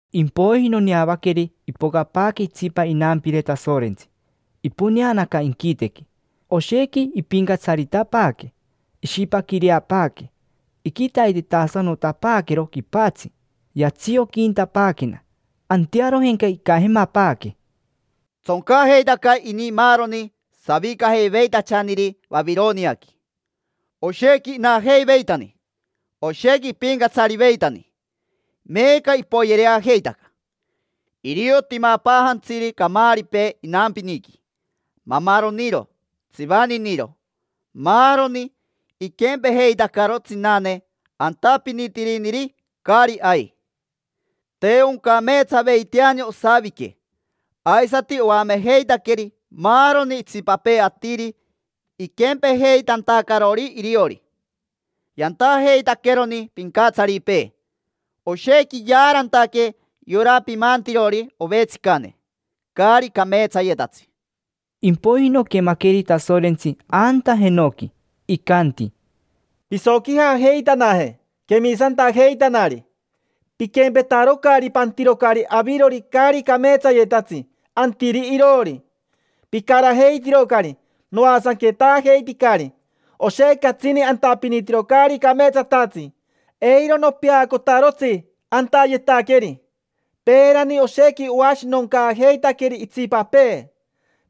Impoiji noneavaqueri ipocapaaque itsipa inampire Tasorentsi, iponeanaca inquitequi. Oshequi ipincatsaritapaaque, ishipaquireapaaque, iquitaitetasanotapaaquero quipatsi, yatsioquintapaaquena. Antearojenca icajemapaaque: —Tsoncajeitaca ini maaroni savicajeiveitachaniri Vavironiaqui; oshequi inajeiveitani, oshequi ipincatsariveitani, meeca ipoyereajeitaca. Irio timapaajantsiri camaaripee inampiniqui, mamaroniro, tsivaniniro, maaroni. Iquempejeitacaro tsinane, antapinitiriniri caari ai. Te oncameetsaveiteani osavique, aisati oamejeitaqueri maaroni itsipapee atiri iquempejeitantacarori iriori. Yantajeitaqueroni pincatsaripee; oshequi yaarantaque yora pimantirori ovetsicane, caari cameetsayetatsi. Impoiji noquemaqueri Tasorentsi anta jenoqui, icanti: —Pisoquijajeitanaje, quemisantajeitanari: piquempetarocari, pantirocari avirori caari cameetsayetatsi antiri iroori. Picarajeitirocari, noasanquetaajeiticari. Oshequi catsini antapinitiro caari cameetsatatsi. Eiro nopeacotarotsi antayetaqueri. Peerani oshequi oashinoncaajeitaqueri itsipapee,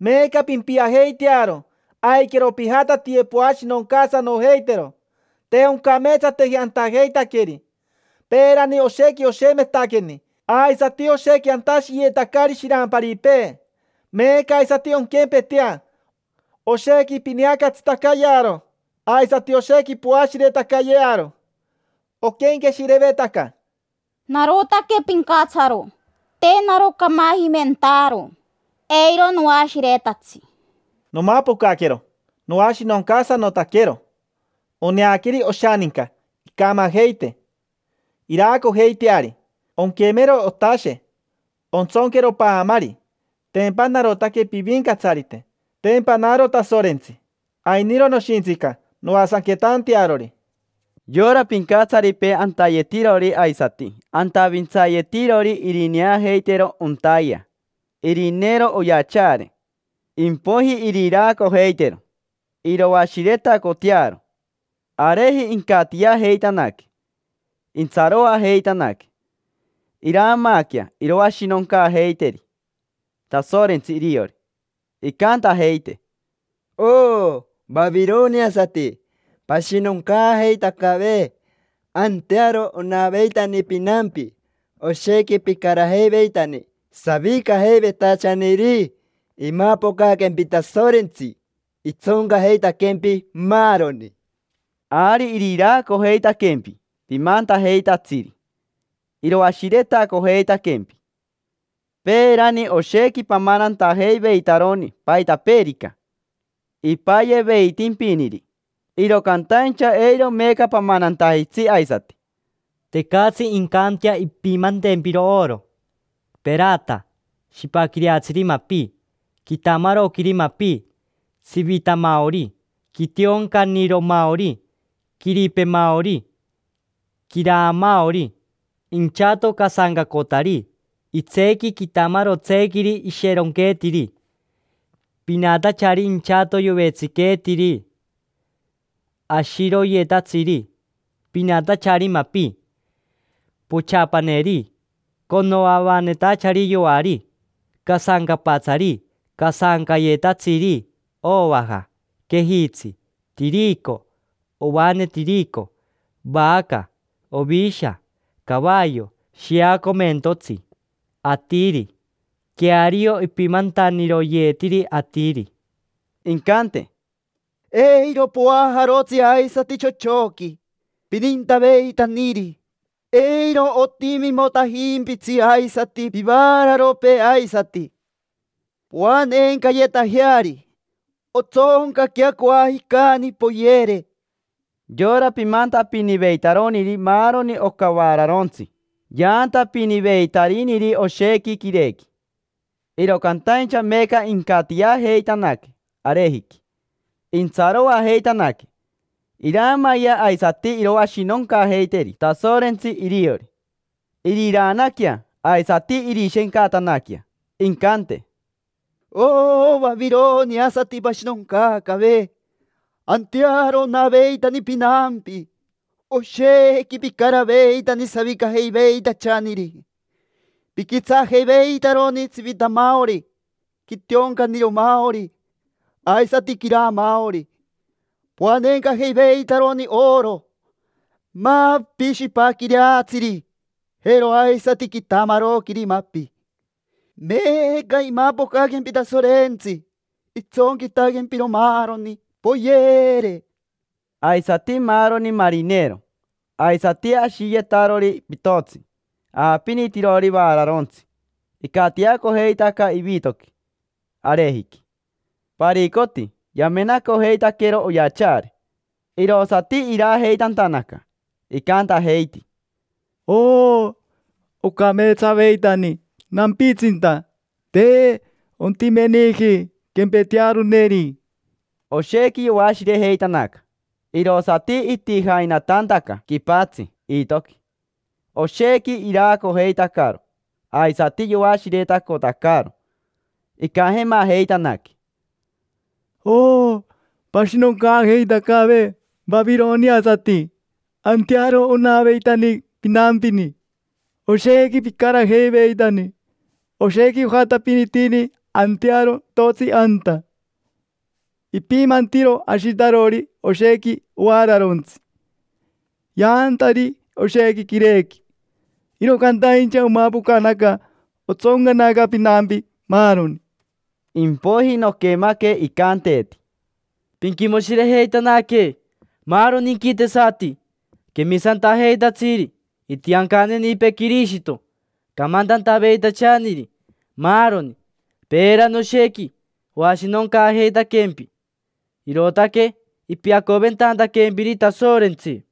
meeca pimpiajeitearo, aiquero pijatatiye poashinoncaasanojeitero. Te oncameetsateji antajeitaqueri. Peerani oshequi oshemetaqueni aisati oshequi antashiyetacari shiramparipee; meeca aisati onquempetea, oshequi pineacatsitacayearo aisati oshequi poashiretacayearo. Oquenqueshirevetaca: “Narotaque pincatsaro, te naro camajimentaaro, eiro noashiretatsi”. Nomapocaquero noashinoncaasanotaquero; oneaqueri oshaninca incamajeite, iraacojeiteari, onquemero otashe; ontsonquero paamari. Tempa narotaque pivincatsarite, tempa naro Tasorentsi. Ainiro noshintsinca noasanquetantearori. Yora pincatsaripee antayetirori aisati antavintsayetirori irineajeitero ontaayea, irineero oyachaare; impoiji iriraacojeitero, iroashiretacotearo. Areji incatiajeitanaque; intsaroajeitanaque, iraamaaquea iroashinoncaajeiteri Tasorentsi iriori. Incantajeite: —Oo, vavironiasati, pashinoncaajeitacave. Antearo onaveitani pinampi, oshequi picarajeiveitani savicajeiveitachaniri. Imapocaquempi Tasorentsi, itsoncajeitaquempi, maaroni. Ari iriraacojeitaquempi pimantajeitatsiri, iroashiretacojeitaquempi. Peerani oshequi pamanantajeiveitaroni paitapeerica ipayeveitimpiniri, iro cantaincha eiro meeca pamanantajitsi aisati. Tecatsi incantea impimantempiro oro, perata, shipaquireatsiri mapi, quitamaroquiri mapi, tsivitamaori, quitioncaniromaori, quiripemaori, quiraamaori, inchato casancacotari, itseequi quitamarotseequiri isheronqueetiri, pinatachari inchato yovetsiqueetiri, ashiroyetatsiri, pinatachari mapi, pochapaneri, conoavanetachari yoari, casancapatsari, casancajayetatsiri, ovaja, quejitsi, tirico, ovane tirico, vaca, ovisha, cavayo, shiacomentotsi, atiri; queario, ipimantaniroyetiri atiri. Incante: —Eiro poajarotsi aisati chochoqui pinintaveitaniri; eiro otimimotajimpitsi aisati pivaararopee aisati poanencayetajeari: ontsoncaquea coajicani, poyere. Yora pimantapiniveitaroniri maaroni oca vaararontsi yaantapiniveitariniri oshequi quireequi; iro cantaincha meeca incatiajeitanaque arejiqui, intsaroajeitanaque, iraamayea aisati iroashinoncaajeiteri Tasorentsi iriori. Iriraanaquea aisati irishencatanaquea, jii, jii, jii. Incante: —Oo, vavironiasati, pashinoncaacave. Antearo onaveitani pinampi, oshequi picaraveitani savicajeiveitachaniri. Piquitsaajeiveitaroni tsivitamaori, quitioncaniromaori, aisati quiraamaori, poanencajeiveitaroni oro, mapi shipaquireatsiri, jero aisati quitamaroquiri mapi. Meeca imapocaquempi Tasorentsi, itsonquitaquempiro maaroni, poyere. Aisati maaroni marinero aisati ashiyetarori pitotsi aapinitirori vaararontsi icatiacojeitaca ivitoqui, arejiqui. Paricoti yamenacojeitaquero oyachaare, povaa, irosati iraajeitantanaca. Icantajeiti: —Oo, ocameetsaveitani nampitsinta, te ontimeniji quempetearoneri. Oshequi yoashirejeitanaca, irosati itijainatantaca quipatsi iitoqui. Oshequi iraacojeitacaro aisati yoashiretacotacaro, icajemajeitanaque: —Oo, pashinoncaajeitacave vavironiasati, antearo onaveitani pinampini, oshequi picarajeiveitani. Oshequi ojatapinitini antearo pitotsi anta, ipimantiro ashitarori oshequi ovaararontsi, yaantariri oshequi quirequi. Iro cantaincha omapocanaca otsoncanaca pinampi, maaroni. Impoiji noquemaque icanteeti: —Pinquimoshirejeitanaque, maaroni inquitesati: quemisantajeitatsiri, itiancanenipee Quirishito, camantantaveitachaniri, maaroni. Peerani oshequi oashinoncaajeitaquempi, irootaque ipiatacoventantaquempiri Tasorentsi.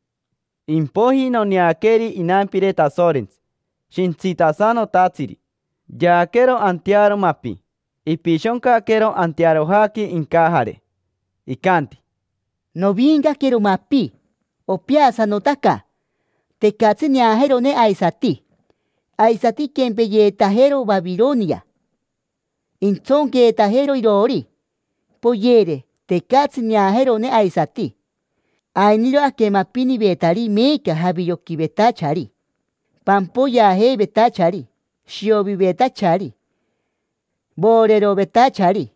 Impoiji noneaqueri inampire Tasorentsi, shintsitasanotatsiri. Yaaquero antearo mapi, ipishoncaquero antearojaqui incajare, pocn. Icanti: —Noviincaquero mapi, opeasanotaca; tecatsi neajeroneri aisati. Aisati inquempeyeetajero Vavironia, intsonqueetajero iroori, poyere; tecatsi neajeroneri aisati. Ainiro aquemapinivetari meeca javioquivetachari, pampoyeajeivetachari, shiovivetachari, voorerovetachari;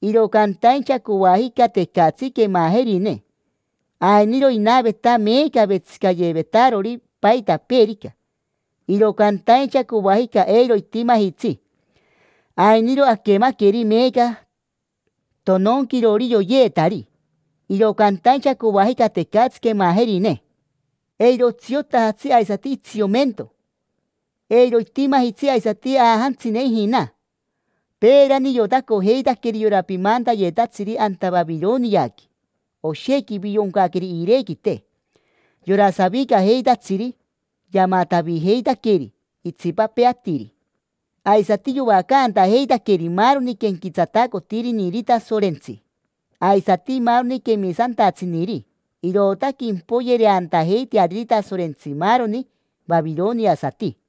iro cantaincha coajica tecatsi quemajerine. Ainiro inaveta meeca vetsicayevetarori paitapeerica, iro cantaincha coajica eiro itimajitsi. Ainiro aquemaqueri meeca tononquirori yoyeetari, tonon, tonon, tonon; iro cantaincha coajica tecatsi quemajerine. Eiro otsiotajatsi aisati itsiomento; eiro itimajitsi aisati aajantsine ijina. Peerani iotacojeitaqueri yora pimantayetatsiri anta Vavironiaqui, oshequi ivioncaqueri iirequite. Yora savicajeitatsiri yamatavijeitaqueri itsipapee atiri, aisati yoacantajeitaqueri maaroni quenquetsatacotiriniri Tasorentsi, aisati maaroni quemisantatsiniri; irootaque impoyereantajeiteariri Tasorentsi maaroni vavironiasati.